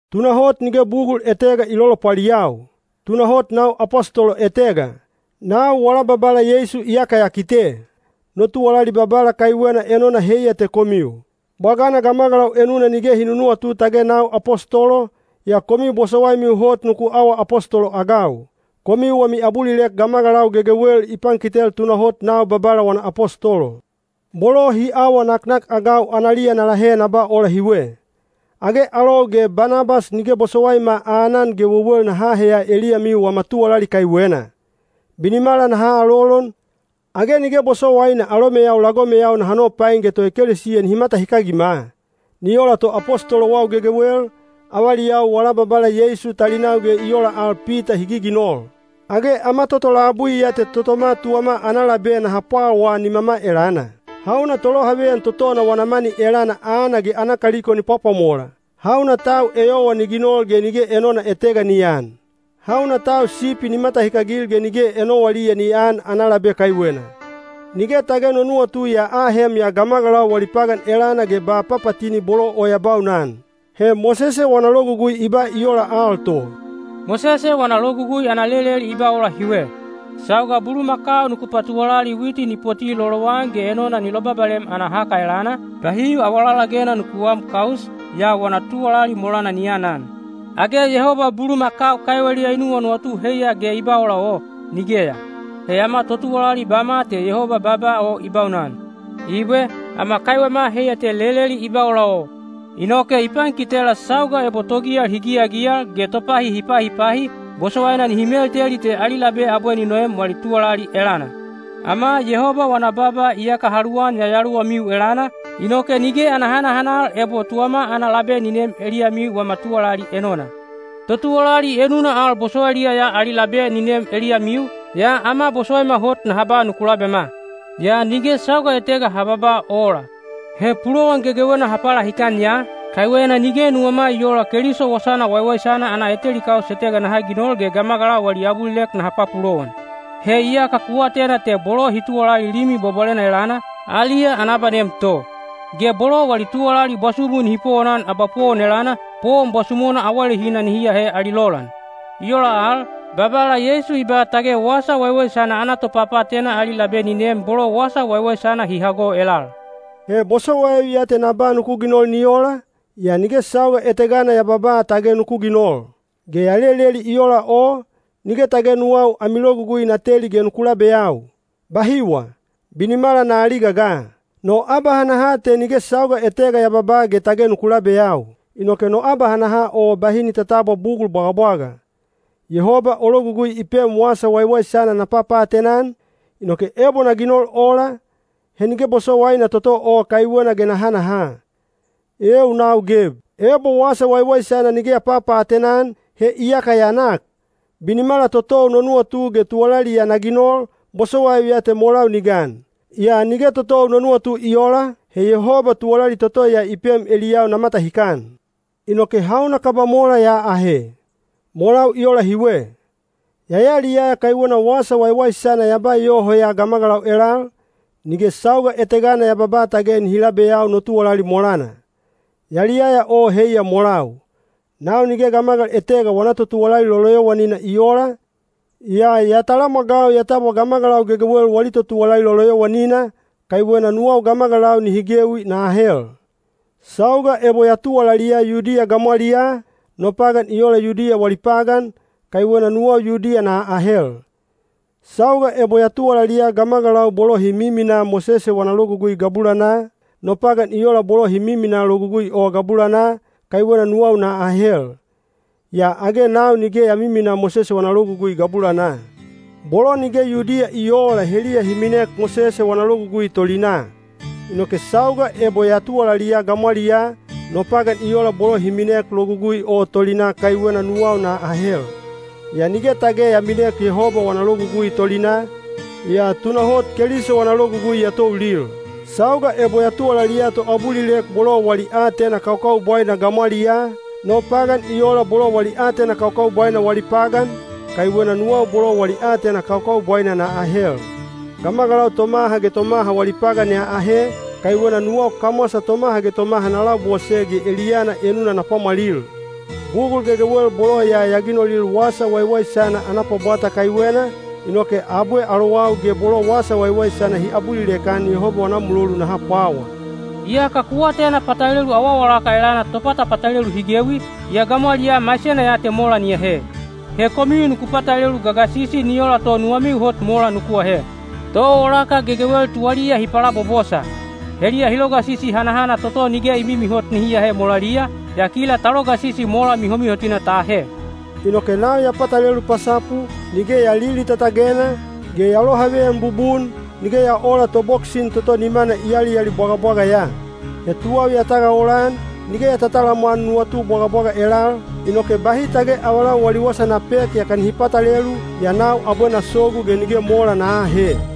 Tunahot nige bugul etega i lolopwaliyau! Tunahot nau apostolo etega! Nau wala Babala Yeisu iyaka ya kite! No tuwalali Babala kaiwena enona heiya te komiu. Bwagana gamagalau enuna nige hi nunuwatu tage nau apostolo, yaa komiu bosowaimiu hot nuku awa apostolo-agau. Komiu wami abulilek gamagalau gegewel i pankitel tunahot nau Babala wana apostolo. Bolo hi awa naknakagau analiya na lahe na ba ola hiwe. Age alou ge Banabas nige bosowaima aanan ge wewel naha aheya eliyamiu wama tuwalali kaiwena? Binimala naha alolon, age nige bosowaina alomeyau lagomeyau naha nopain ge toekelesiya nihi matahikagima? Ni ola to apostolowau gegewel, avaliyau wala Babala Yeisu talinau ge i ola al Pita hi giginol. Age ama toto labui ya te totoma tuwama ana labe naha pwawaa nimama elana? Hauna tolohaveyan totona wana mani elana aana ge ana kaliko ni pwapwamola? Hauna tau eyowa ni ginol ge nige enona etega ni aan? Hauna tau sipi ni matahikagil ge nige enowaliya ni aan ana labe kaiwena? Nige tage no nuwatu ya ahem ya gamagalau wali pagan elana ge ba papatini bolo o ya baunan. He Mosese wana Logugui i ba i ola al to. Mosese wana Logugui ana leleli i ba ola hiwe: “Sauga bulumakau nuku patuwalali witi ni poti lolowan ge enona ni lobabalem ana haka elana, bahi awalalagena nuku aam kaus, yaa wana tuwalali molana ni anan.” Age Yehoba bulumakau kaiweliya i nuwanuwatu heiya ge i ba ola o? Nigeya. He ama totuwalali bama te Yehoba baaba o i baunan. Ibwe, ama kaiwema heiya te leleli i ba ola o. Inoke i pankitela sauga ebo togiyal hi giyagiyal ge topahi hi pahipahi, bosowaina nihi melteli te ali labe abwe ni noem wali tuwalali elana. Ama Yehoba wana baaba iyaka ha luwan yayaluwamiu elana, inoke nige ana hanahanal ebo tuwama ana labe ni neem eliyamiu wama tuwalali enona. Totuwalali enuna al bosowailiya ya ali labe ni neem eliyamiu, yaa ama bosowaima hot naha ba nuku labema. Yaa nige sauga etega ha babaa ola. He pulowan gegewena ha palahikan ya, kaiwena nige nuwama i oola Keliso Wasana Waiwaisana ana eteli kaus etega naha ginol ge gamagalau wali abulilek naha papulowan. He iyaka ku atena te bolo hi tuwalali Limi Bwabwalena elana, aliya ana abanem to. Ge bolo wali tuwalali bwasumu nihi powonan abapowon elana, powon bwasumona awalehina nihi ahe ali lolan. I ola al, Babala Yeisu i ba tage Wasa Waiwaisana ana topapaatena ali labe ni neem bolo Wasa Waiwaisana hi hago elal. He bosowaiu ya te na ba nuku ginol ni ola, yaa nige sauga etegana ya babaa tage nuku ginol. Ge ya leleli i ola o, nige tage nuwau ami logugui na teli ge nuku labeyau. Bahiwa! Binimala na aliga ga! No abahanaha te nige sauga etega ya babaa ge tage nuku labeyau. Inoke no abahanaha o bahi ni tatabwa bugul bwagabwaga. Yehoba o logugui i pem Wasa Waiwaisana na papaatena-an, inoke ebo na ginol ola, he nige bosowaina toto o kaiwena ge na hanaha. Eeu nau geb! Ebo wasa waiwaisana nige ya papapaatena-an, he iyaka ya nak! Binimala totou no nuwatu ge tuwalali ya na ginol, bosowaiu ya te molau ni gan. Yaa nige totou no nuwatu i oola, he Yehoba tuwalali toto ya i pem eliyau na matahikan. Inoke hauna kaba mola ya ahe? Molau i ola hiwe. Ya yaliyaya kaiwena Wasa Waiwaisana ya ba yoho ya gamagalau elal, nige sauga etegana ya babaa tage nihi labeyau no tuwalali molana. Yaliyaya o heiya molau. Nau nige gamagal etega wana totuwalali loloyowanina i oola, yaa ya talamwagau ya tabwa gamagalau gegewel wali totuwalali loloyowanina, kaiwena nuwau gamagalau nihi gewi na ahel. Sauga ebo ya tuwalaliya Yudiya gamwaliyaa, no pagan i ola Yudiya wali pagan, kaiwena nuwau Yudiya na ahel. Sauga ebo ya tuwalaliya gamagalau bolo hi miminaa Mosese wana Logugui gabulanaa, no pagan i ola bolo hi miminaa Logugui o gabulanaa, kaiwena nuwau na ahel. (Yaa age nau nige ya miminaa Mosese wana Logugui gabulanaa.) Bolo nige Yudiya i oola heliya hi minek Mosese wana Logugui tolinaa. Inoke sauga ebo ya tuwalaliya gamwaliyaa, no pagan i ola bolo hi minek Logugui o tolinaa kaiwena nuwau na ahel. (Yaa nige tage ya minek Yehoba wana logugui tolinaa, yaa tunahot Keliso wana logugui ya toulil.) Sauga ebo ya tuwalaliya toabulilek bolo wali aatena kaukaubwaina gamwaliyaa, no pagan i ola bolo wali aatena kaukaubwaina wali pagan, kaiwena nuwau bolo wali aatena kaukaubwaina na ahel. Gamagalau tomaha ge tomaha wali pagan ya ahe, kaiwena nuwau kamwasa tomaha ge tomaha na labose ge eliyana enuna na pwamwalil. Bugul gegewel bolo ya ya ginolil Wasa Waiwaisana ana pwabwata kaiwena, inoke abwe alowau ge bolo Wasa Waiwaisana hi abulilek-an Yehoba wana mulolu naha pwawa. Iyaka ku atena patalelu awaawalaka elana topatapatalelu hi gewi, yaa gamwaliyaa maisena ya te mola ni ahe. He komiu nuku patalelu gagasisi ni ola to nuwamiu hot mola nuku ahe. Toawalaka gegewel tuwaliya hi palabobosa. Heliya hi logasisi hanahana toto nige i mimihot nihi ahe molaliya, yaa kila ta logasisi mola mihomihotina ta ahe. Inoke nau ya patalelu pasapu, nige ya lilitatagena, ge ya lohaveyan bubun, nige ya oola toboksin toto nimana i alialibwagabwaga ya. He tuwau ya tagaolan, nige ya tatalamwan nuwatu bwagabwaga elal, inoke bahi tage avalau wali wasa na pek yaka nihi patalelu, yaa nau abwe na sogu ge nige mola na aahe.